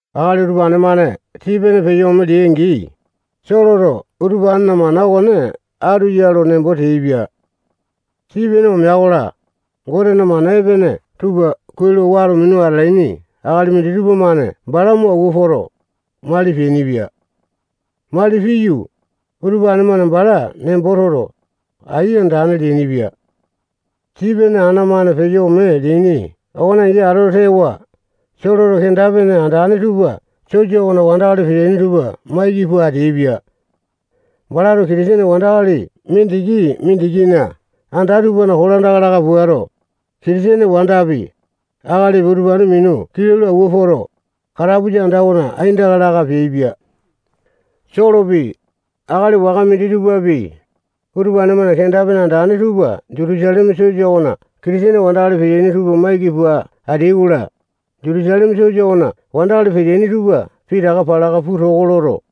Akali utupane-mane Sipene peyo ome leai-angi, Soloto utupanena mana okone katu ya lo nembo teaipia. Sipene omea-kola, Gotena mana epene tupa kuai lo wato minu atalaini akali minditupa-mane bala mo awua poto, mali peainipia. Mali piyu, utupane-mane bala nembo toto, ai andane leainipia. Sipene ana-mane peyo ome leaini okone angi atoto tewa, Soloto kenda-pene andane tupa sosa okona wandakali peteaini tupa maiki pua ateaipia. Balato Kitisene wandakali mindiki-mindikina anda tupana kolandaka laka puato, Kitisene wandapi, akalipi, utupane minu kilau lo awua poto, katapusa anda okona aindaka laka peaipia. Solopi, akali waka minditupapi, utupane-mane kenda-pene andane tupa Jutusaleme sosa okona Kitisene wandakali peteaini tupa maiki pua ateai-kola, Jutusaleme sosa okona wandakali peteaini tupa pitaka palaka puu toko loto,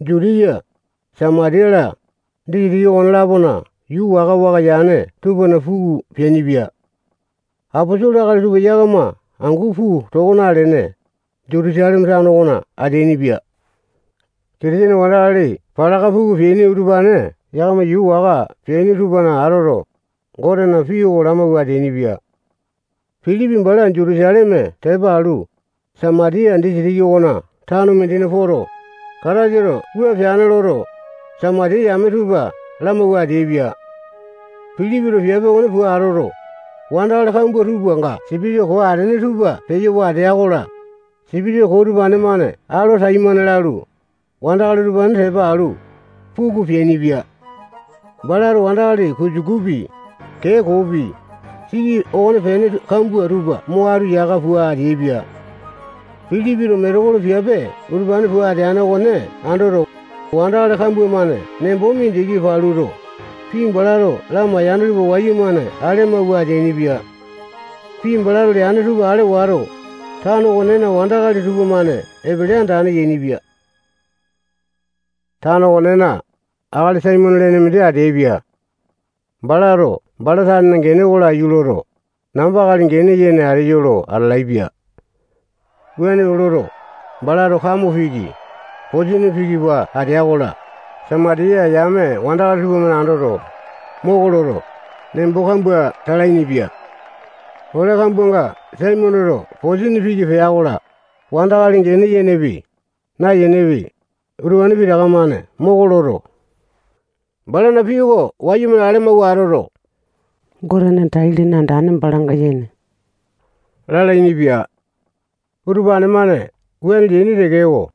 Jutiya, Samatiya-la, disitiki okone-lapona yuu waka-waka yane tupana puku peainipia. Aposolo akali tupa yakama angu puu toko nalene, Jutusaleme tano okona ateainipia. Kitisene wandakali palaka puku peaini utupane yakama yuu waka peaini tupana atoto, Gotena pii oko lamawua ateainipia. Pilipi bala Jutusaleme tepa alu, Samatiya disitiki okona tano mindina poto, Kataisato wua peane loto, Samatiya yame tupa lamawua ateaipia. Pilipito piape okone pua atoto, wandakali kambua tupanga sipitisa koo atene tupa peyo watea-kola, sipitisa koo utupane-mane alo taimane lalu, wandakali utupane tepa alu, puku peainipia. Balato wandakali kusukupi, kee koopi, siki okonepene kambua tupa mo atu yaka pua ateaipia. Pilipito metekolo piape utupane pua ateane okone andoto, wandakali kambua-mane nembo mindiki paluto, pii balato lamaiyane tupa wayumane ale amawua ateainipia. Pii balato leane tupa ale wato, tano okonena wandakali tupamane epele andane yainipia. Tano okonena, akali Saimone lene mindi ateaipia. Balato bala tanena gene oko laiyu loto, namba akali gene yene ateyo lo atalaepia. Wuane loto, balato kamo piki, posini piki pua atea-kola, Samatiya yame wandakali tupamane andoto, moko loto, nembo kambua talainipia. Ole kambuanga Saimoneto posini piki pea-kola, wandakali gene yenepi, nayenepi, utupane pitaka-mane moko loto, balana pii oko wayumane ale amawua atoto, Gotena tai-lene andane balanga yene lalainipia. Utupane-mane wuane leaini tekeko,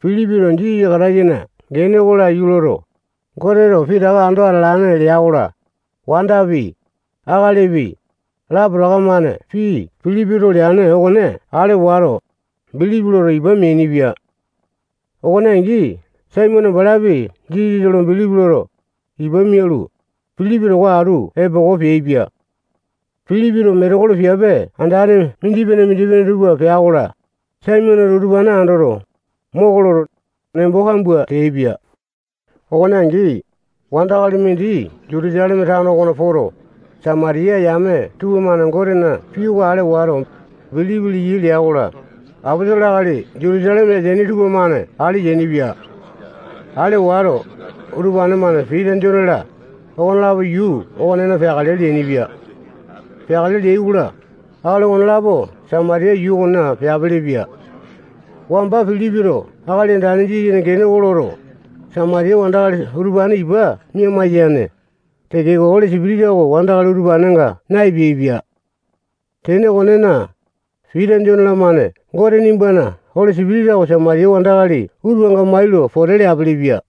Pilipito Jisasa Kataisana gene oko laiyu loto, Goteto pitaka ando atalane lea-kola, wandapi, akalipi, lapotaka-mane pii Pilipito leane okone ale wato, bilipi loto, ipa meainipia. Okone angi Saimone balapi Jisasa lo bilipi loto, ipa mialu, Pilipi towa atu epoko peaipia. Pilipito metekolo piape andane mindipene-mindipene tupa pea-kola, Saimoneto utupane andoto, moko loto, nembo kambua teaipia. Okone angi, wandakali mindi Jutusaleme tano okona poto, Samatiya yame tupamane Gotena pii oko ale wato, bilipi leyai lea-kola, aposolo akali Jutusaleme ateaini tupamane ale yainipia. Ale wato, utupane-mane Pita, Jone-la, okonelapo yuu okonena peakale leainipia. Peakale leai-kola, akali okonelapo Samatiya yuu okona peapelepia. Wamba Pilipito Akali Andane Jisasana gene loto, Samatiya wandakali utupane ipa mia-maiyane tekeko, Oli Sipitisa oko wandakali utupanenga na-epeaipia. Tene okonena, Pita, Jone-lamane Gote nimbana Oli Sipitisa oko Samatiya wandakali utupanenga mai lo pote leapilipia.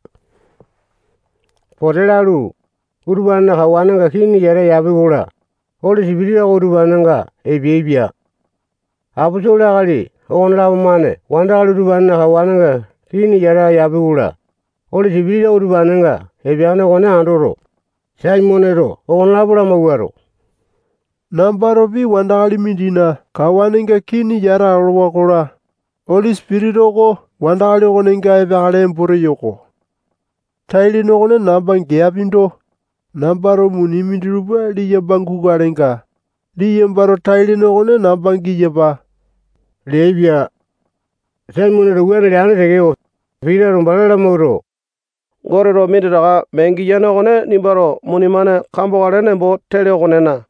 Pote lalu, utupanena kawanenga kini yata yapi-kola, Oli Sipitisa oko utupanenga epeaipia. Aposolo akali okonelapo-mane wandakali utupanena kawanenga kii yata yapi-kola, Oli Sipitisa oko utupanenga epeane okone andoto, Saimoneto okonelapo lamawuato, nambatopi wandakali mindina kawanenga kini yata olowa-kola, Oli Sipitisa oko wandakali okonenga epeakale nembo teyo-ko. Tai lene okone namba geapindo, nambato muni minditupa liyamba gukalenga, liyambato tai-lene okone namba giyapa leaipia. Saimoneto wuane leane tekeko, Pitato bala lamawuato, Goteto minditaka mee giyane okone nimbato muni-mane kambokale nembo tele okonena,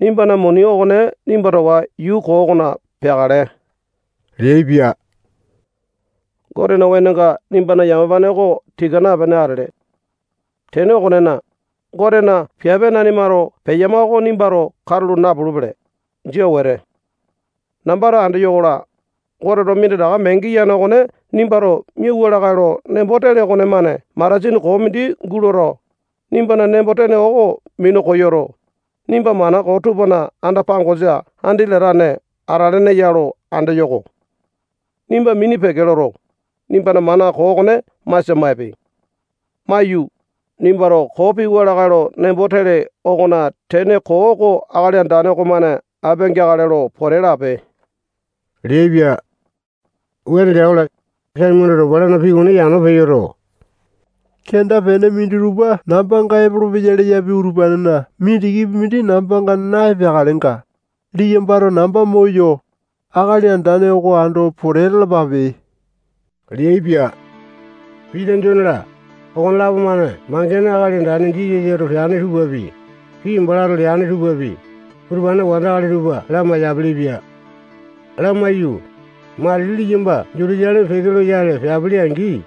nimbana muni okone nimba towa yuu koo okona peakale leaipia. Gotena wenonga nimbana yamapane oko tika napene atele. Tene okonena, Gotena piape nanimato peyama oko nimbato katulo napulupele. Jia wete. Nambato andeyo-kola, Goteto minditaka mee giyane okone nimbato miauwa lakae lo nembo tele okonemane matasini koo mindi guloto, nimbana nembo-tene oko minu koyoto, nimba mana koo tupana anda-pangosa andi latane atalene ya lo andeyo-ko. Nimba mini peke loto, nimbana mana koo okone masia maipe. Maiyu, nimbato koo piwa lakae lo nembo tele okona tene koo oko Akali Andane okomane apia-geakale lo pote lape leaipia. Wuane lea-kola, Saimoneto balana pii okone yano peyoto, kenda-pene minditupa nambanga epolopeya leyapi utupanena mindikipi mindi nambanga na-epeakalenga, liyambato namba moyo, Akali Andane oko ando pote lalapape leaipia. Pita, Jone-la, okonelapo-mane mangene Akali Andane Jisasato peane tupapi, pii balato leane tupapi, utupane wandakali tupa lamai-yapilipia. Lamaiyu, matili liyamba Jutusaleme peke loyale peapili-angi,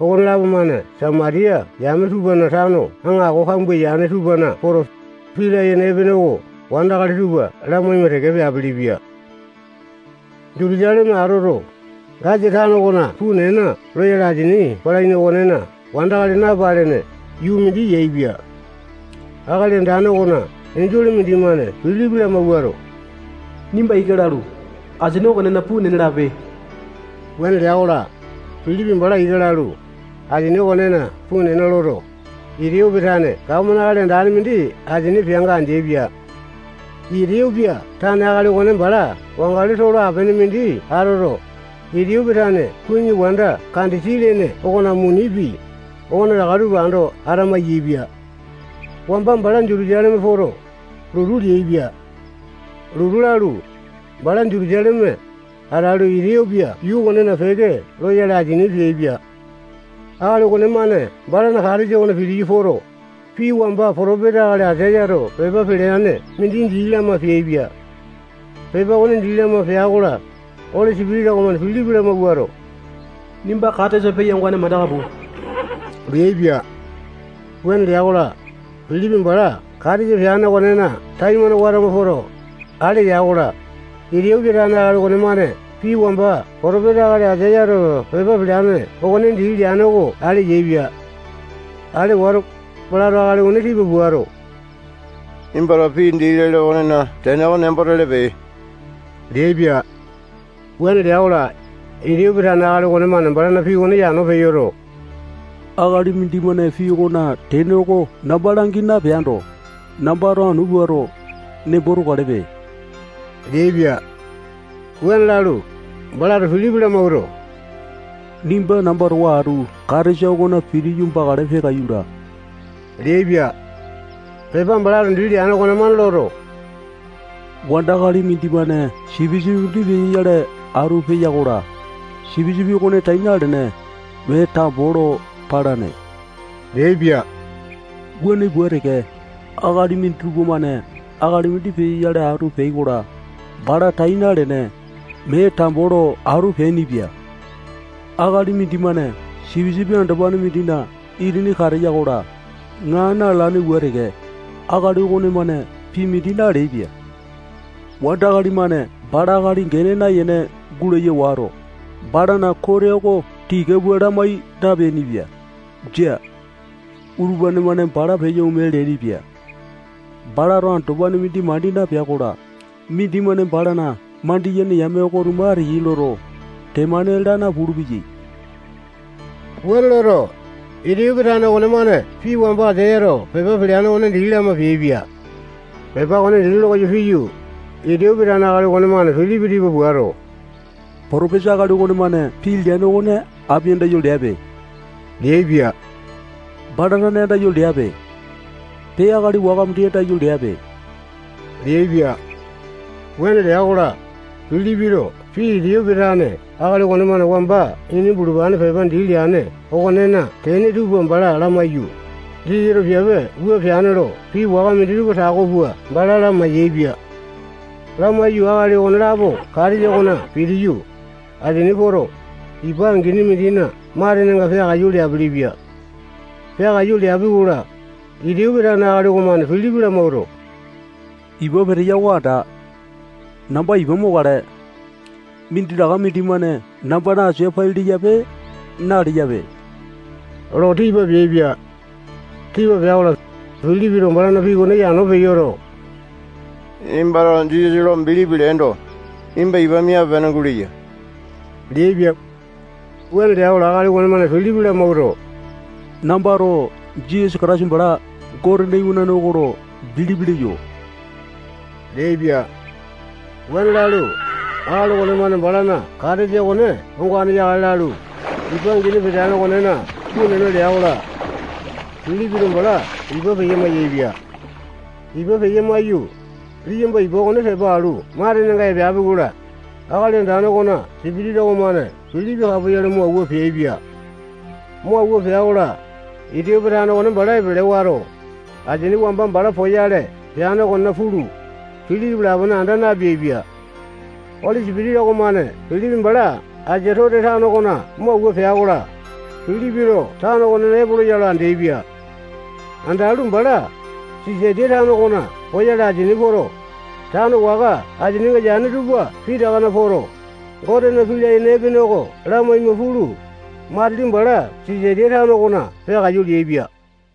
okonelapo-mane Samatiya yame tupana tano aŋako kambua yane tupana poto, pii layene epene oko wandakali tupa lamaima teke peapilipia. Jutusaleme atoto, Gasa tano okona puu nena lolane asini palaini okonena wandakali napalene yuu mindi yaepia. Akali Andane okona enjole mindimane Pilipi lamawuato, nimba ika lalu, asini okonena puu nena lape leaipia. Wuane lea-kola, Pilipi bala ika lalu, asini okonena puu nena loto, Itiyopia tane gapomane akali andane mindi asini peanga andeaipia. Itiyopia tane akali okone bala wangali tolo apene mindi atoto, Itiyopia tane kuwini wanda Kandesi lene okona munipi, okonetaka tupa ando ata-maiyaepia. Wamba bala Jutusaleme poto, lotu leaipia. Lotu lalu, bala Jutusaleme atalu, Itiyopia yuu okona peke loyale asini peaipia. Akali okonemane balana katesa okona pitiyu poto, pii wamba potopesa akali Aisayato pepa peleane mindi dii lama peaipia. Pepa okone dii lama pea-kola, Oli Sipitisa okomane Pilipi lamawuato, nimba katesa peya ongane mandaka puu leaipia. Wuane lea-kola, Pilipi bala katesa peane okonena taimane watama poto, ale ya-kola, Itiyopia tane akali okonemane pii wamba potopesa akali Aisayato pepa peleane okone dii leane oko ale yaepia. Ale wato, balato akali okone tipa puato, nimbato pii dii lele okonena tene oko nembo telepe leaipia. Wuane lea-kola, Itiyopia tane akali okonemane balana pii okone yano peyoto, akali mindimane pii okona tene oko namba langi napeando, nambato anu puato, nembo tokalepe leaipia. Wuane lalu, balato Pilipi lamawuato, nimba namba towa atu katesa okona pitiyu bakale, peakaiyu laa leaipia. Pepa balato dii leane okonemane loto, wandakali mindimane sipisipi mindi peyoyale atu peya-kola, sipisipi okone tai nalene, mee tambo lo palane leaipia. Wuane pua teke, akali minditupa-mane akali mindi peyoyale atu peai-kola, bala tai nalene, mee tambo lo atu peaipia. Akali mindimane sipisipi andopane mindina itini kateya-kola, ŋaa na-lalane pua teke, akali okonemane pii mindi naleaipia Wandakali-mane bala akali gene nayene gulaya wato, balana kote oko tika pua lamai napeainipia. Jia. Utupane-mane bala peyo ome leainipia. Balato andopane mindi mandi napea-kola, mindimane balana mandiyene yame oko-tuma ateyai loto, temane laa napulu-peya. Wuane loto, Itiyopia tane okonemane pii wamba Aisayato pepa peleane okone dii lama peaipia. Pepa okone dii lokoyo piyu, Itiyopia tane akali okonemane Pilipi tipa puato, potopesa akali okonemane pii leane okone api andayo leape leaipia. Bala tane andayo leape. Pee, akali waka mindi andayo leape leaipia. Wuane lea-kola, Pilipito pii Itiyopia tane akali okonemane wamba ini bulupane pepa dii leane okonena tene tupa bala lamaiyu, Jisasato piape wua peane lo pii waka minditupa tako pua bala lamai-yaepia. Lamaiyu, akali okonelapo katesa okona pitiyu, asini poto, ipa angini mindina matenenga peakaiyu leapilipia. Peakaiyu leapi-kola, Itiyopia tane akali okomane Pilipi lamawuato, ipa peteya oko anda. Namba ipa mokale. Minditaka mindimane nambana asia pai leyape, naleyape lo tipa peaipia. [Tipa pea-kola, Pilipito balana pii okone yano peyoto, nimbato Jisasa lo bilipi leendo, nimba ipa miape-pene guleya leaipia. Wuane lea-kola, akali okonemane Pilipi lamawuato, nambato Jisasa Kataisa bala Gotena iwanane oko lo bilipi leyo leaipia]. Wuane lalu, akali okonemane balana katesa okone ongane yakale lalu, ipa angini peteane okonena puu nena lea-kola, Pilipito bala ipa peya-mayaepia. Ipa peya-maiyu, liyamba ipa oko tepa alu matenenga epeapi-kola, Akali Andane okona Sipitisa okomane Pilipi kapoyale mo awua peaipia. Mo awua pea-kola, Itiyopia tane okone bala epele wato, asini wamba bala poyale peane okonena pulu, Pilipi lapone anda napeaipia. Oli Sipitisa okomane Pilipi bala Asatote tano okona mo awua pea-kola, Pilipito tano okonena epolo ya lo andeaipia. Andalu, bala Sisatiya tano okona poyale asini poto, tano waka asininga yane tupa pitakana poto, Gotena pii layene epene oko lamaima pulu, matili bala Sisatiya tano okona peakaiyu leaipia.